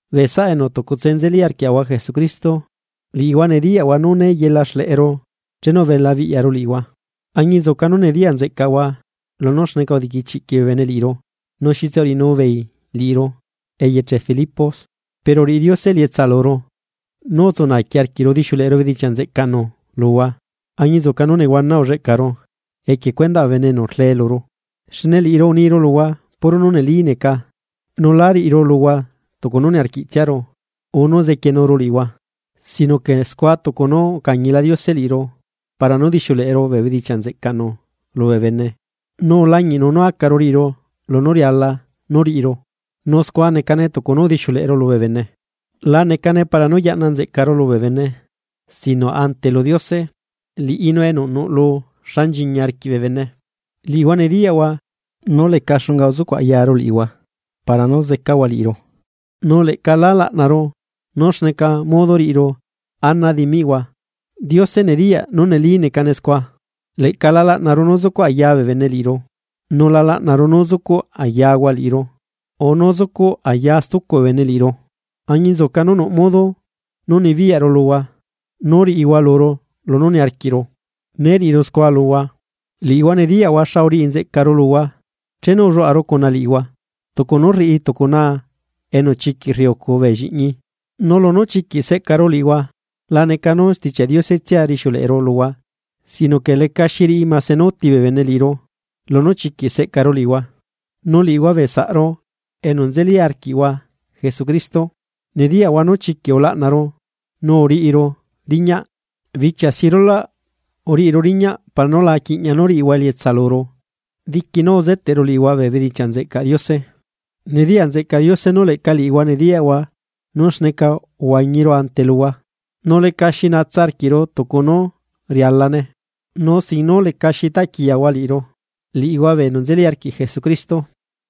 Bee saꞌa enu tucutse nzeli arquiaꞌahua Jesucristo, liꞌihua nediyaꞌhua nú né yela xleꞌeru chenu ubela biꞌyaru liꞌihua, añinzuca nú nediyaꞌ nzeꞌcaꞌhua lunú xneca udiquichiꞌquiꞌ bee bene liꞌiru nu xitse uriꞌinubeei liꞌiru eyeche Filipos. Pero uriꞌi Diose elietsa luru nú utsu naaqui arquiꞌru udixiuleꞌeru bedichiaꞌ nzeꞌcaꞌnu luhua añinzuca nú nehuana ulleꞌcaru equie cuendaꞌ nú ulee bee bene luru. Xne liꞌiru uniru luhua puro nú neli neca nu lá riꞌiru luhua tucu nú niarquiꞌtsiaru urre para nú zequienuru liꞌihua. Sino que scua tucu nú ucañila Diose liꞌiru para nú dixiuleꞌeru bee bedichiaꞌ nzeꞌcaꞌnu lubee bene nu ulañiꞌnu nú acaru riꞌiru lunú riala nú riꞌiru, nu scua necane tucu nú udixiuleꞌeru lubee bene. La necane para nú yaꞌna nzeꞌcaru lubee bene sino ante lu Diose. Liꞌinu enu nuꞌlu xa nchiñi arquiꞌ bee bene. Liꞌihua nediyaꞌhua nú leca xunga uzucuꞌ ayaru liꞌihua para nú zecahua liꞌiru, nu leꞌca lá laꞌnaru nú xneca modo riꞌiru ana dimiꞌhua, Diose nediyaꞌ nú neli necane scua. Leꞌca la laꞌnaru nú zucuꞌ aya bee bene liꞌiru, nu la laꞌnaru nú zucuꞌ ayahua liꞌiru urre nú zucuꞌ aya stucu bee bene liꞌiru, añinzuca nú nuꞌ modo nú nibiyaꞌru luhua nú riꞌihua luru lunú niarquiꞌru, né riꞌiru scua luhua. Liꞌihua nediyaꞌhua xa uriꞌi nzeꞌcaru luhua chenu ulluaꞌaru cuna liꞌihua, tucu nú rriꞌi tucu naa enu chiquiꞌ rriucu bee lliꞌñi. Nu lunú chiquiꞌ seꞌcaru liꞌihua laneca nú Stichiaꞌ Diose tsia rixiuleꞌeru luhua sino que lecaxi riꞌi máse nú úti bee bene liꞌiru lunú chiquiꞌ seꞌcaru liꞌihua. Nu liꞌihua bee saꞌru enu nzeli arquiꞌhua Jesucristo nediyaꞌhua nú chiquiꞌ ulaꞌnaru nú uriꞌiru riñaꞌ. Bichia si rulaꞌ uriꞌiru riñaꞌ para nú la quiꞌñia nú ariꞌihua elietsa luru diqui nú uzeteꞌru liꞌihua bee bedichiaꞌ nzeꞌcaꞌ Diose. Nediyaꞌ nzeꞌcaꞌ Diose nú leꞌca liꞌihua nediyaꞌhua nú xneca uhuañiru ante luhua, nu lecali xi dula luꞌcuru, nu sin nú lecaxi taꞌquiyahua liꞌiru, liꞌihua bee enu nzeli arquiꞌ Jesucristo.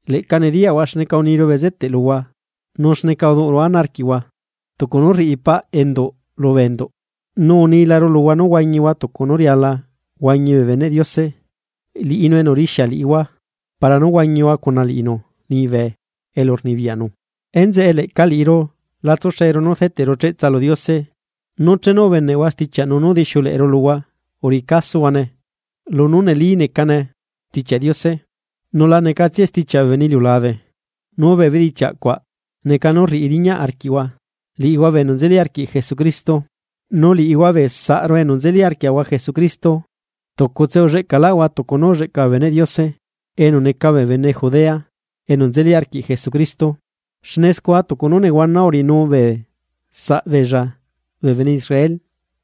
Leꞌca nediyaꞌhua xneca uniru bezeteꞌ luhua nu xneca uduꞌuru ana arquiꞌhua tucu nú rriꞌi paꞌ enduꞌ lu enduꞌ. Nu unilaru luhua nú huañihua tucu nú riala huañi bee beneꞌ Diose, liꞌinu enu rixia liꞌihua para nú huañihua cuna liꞌinu liñibe elu rnibiyaꞌnu. Enzeꞌe leꞌca liꞌiru la tsuxeru nú rdeteꞌru cheꞌtsa lu Diose nú chenu ubeneꞌhua stichiaꞌnu nú udixiuleꞌeru luhua uriꞌi casohuane lunú neli necane Stichiaꞌ Diose, nu lanecatsiae stichiaꞌ bee bene iliulabe. Nu bee bedichiaꞌ cuaꞌ neca nú rriꞌi riñaꞌ arquiꞌhua, liꞌihua bee enu nzeli arquiꞌ Jesucristo. Nu liꞌihua bee saꞌru enu nzeli arquiaꞌahua Jesucristo. Tucutse ulleꞌcaꞌlaꞌahua tucu nú ulleꞌca bee beneꞌ Diose enu neca bee bene Judea enu nzeli arquiꞌ Jesucristo. Xne scua tucu nú nehuana uriꞌinu bee saꞌbeella bee bene Israel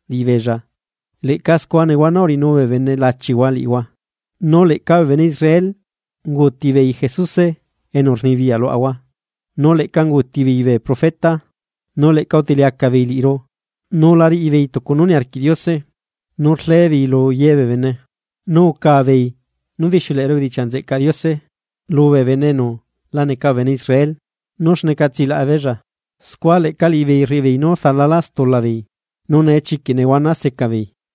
liꞌibeella leꞌca scua nehuana uriꞌinu bee bene lachihua liꞌihua. Nu leꞌca bee bene Israel unguuti beei Jesuse enu rnibiyaꞌ luaꞌahua nu leꞌca unguuti beei bee profeta, nu leꞌca utiliacaꞌ beei liꞌiru nu la riꞌibeei tucu nú niarquiꞌ Diose, nu rlebeei lu ye bee bene. Nu uca beei nú udixiuleꞌeru bedichiaꞌ nzeꞌcaꞌ Diose lubee bene enu la neca bee bene Israel nú xneca tsilaꞌa beella, scua leꞌca liꞌibeei rriꞌibeei nú rdalalá stula beei, nu nee chiquiꞌla nehuana seca beei.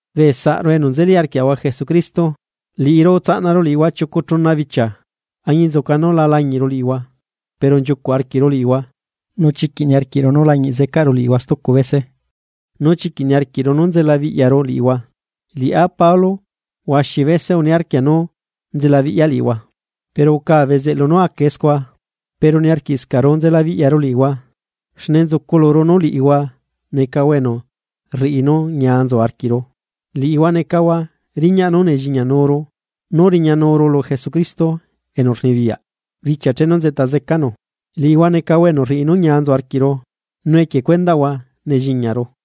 Bee saꞌru enu nzeli arquiaꞌahua Jesucristo, liꞌiru utsaꞌnaru liꞌihua chiucu chuna bichia, añinzuca nú la lañiꞌru liꞌihua pero nchiucuꞌ arquiꞌru liꞌihua nu chiquiꞌ niarquiꞌru nú lañiꞌ zecaꞌru liꞌihua stucu bese. Nu chiquiꞌ uniarquiꞌru nú nzelabiꞌyaru liꞌihua, liꞌá Pablo huaxi bese uniarquia nú nzelabiꞌya liꞌihua. Pero uca bezeꞌlu nú acae scua. Pero niarquiꞌscaꞌru nzelabiꞌyaru liꞌihua xne nzucu luru nú liꞌihua necahua enu rriꞌi nú ñia nzu arquiꞌru, liꞌihua necahua riñaꞌ nú nelliñianuru nú riñayuru lu Jesucristo enu rnibiyaꞌ bichia chenu nzeꞌta zecanu. Liꞌihua necahua enu rriꞌi nú ñia nzu arquiꞌru nu equie cuendaꞌhua nelliñiaru.